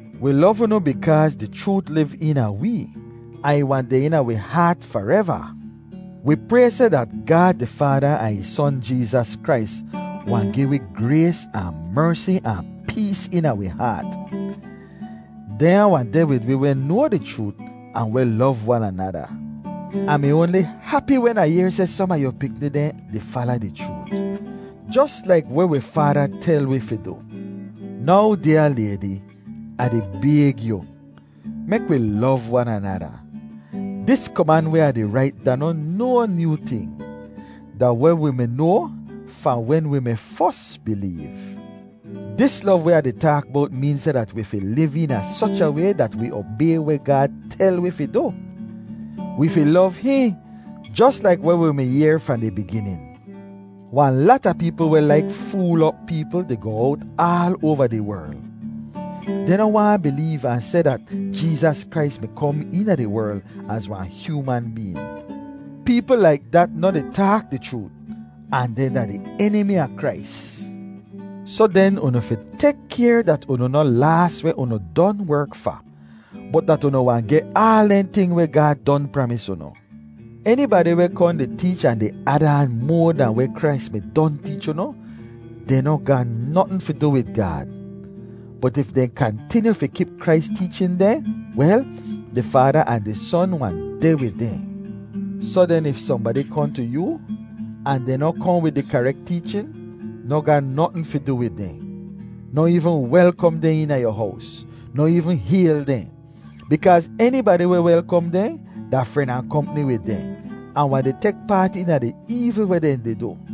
Wi lov unu bikaaz di chroot liv eena wee ahn ih wahn deh eena wi haat fareva. Wi pray seh dat Gaad di Faada ahn ih Son Jeezas Krais wahn gi wi grays ahn mersi ahn pees eena wi haat. Dehnya wahn deh wid wi weh noa di chroot ahn weh lov wan anada. Ah mi oanli hapi wen Ah yehr seh som a yu pikni dehn di fala di chroot, jos laik weh wi Faada tel wi fi du. Now, dyaa laydi, Ah di bayg yu: Mek wi lov wan anada. Dis koman weh Ah di rait da noh no nyoo ting. Da weh wi mi noa fahn wen wi mi fos bileev. Dis lov weh Ah di taak bowt meen seh dat wi fi liv eena soch a way dat wi obay weh Gaad tel wi fi du. Wi fi lov hihn, jos laik weh wi mi yehr fahn di biginin. Wahn lata peepl weh laik fool op peepl, di goh owt aal oava di werl. Dehn noh waahn bileev ahn seh dat Jeezas Krais mi kom eena di werl az wahn hyooman been. Peepl laik dat noh di taak di chroot, ahn dehn da di Enimi a Krais. Soh den, unu fi tek kayr dat unu noh laas weh unu don werk fa, bot dat unu wahn geh aal dehn ting weh Gaad don pramis unu. Enibadi weh kohn di teech ahn di ad aan moa dahn weh Krais mi don teech unu, dehn no ga notn fi du wid Gaad. Bot if dehn kantinyu fi kip Krais teechin dehn, wel, di Faada ahn di Son wahn deh wid dehn. Soh den, if sohnbadi kohn tu yoo, ahn dehn noh kohn wid di karek teechin, noh ga notn fi du wid dehn. Noh eevn welkom dehn eena yu hows; noh eevn hayl dehn. Bikaaz enibadi weh welkom dehn, da fren ahn kompni wid dehn, ahn wahn di tek paat eena di eevl weh dehn di du.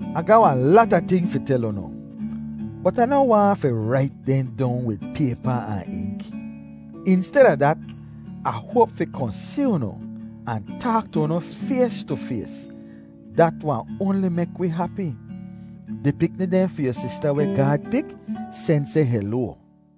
Ah ga wahn lata ting fi tel unu, bot Ah noh waahn fi rait dehn dong wid paypa ahn ink. Insteda dat, Ah hoap fi kohn si unu, ahn taak tu unu fays tu fays; dat wahn oanli mek wi hapi. Di pikni dehn fi yu sista weh Gaad pik, sen seh heloa.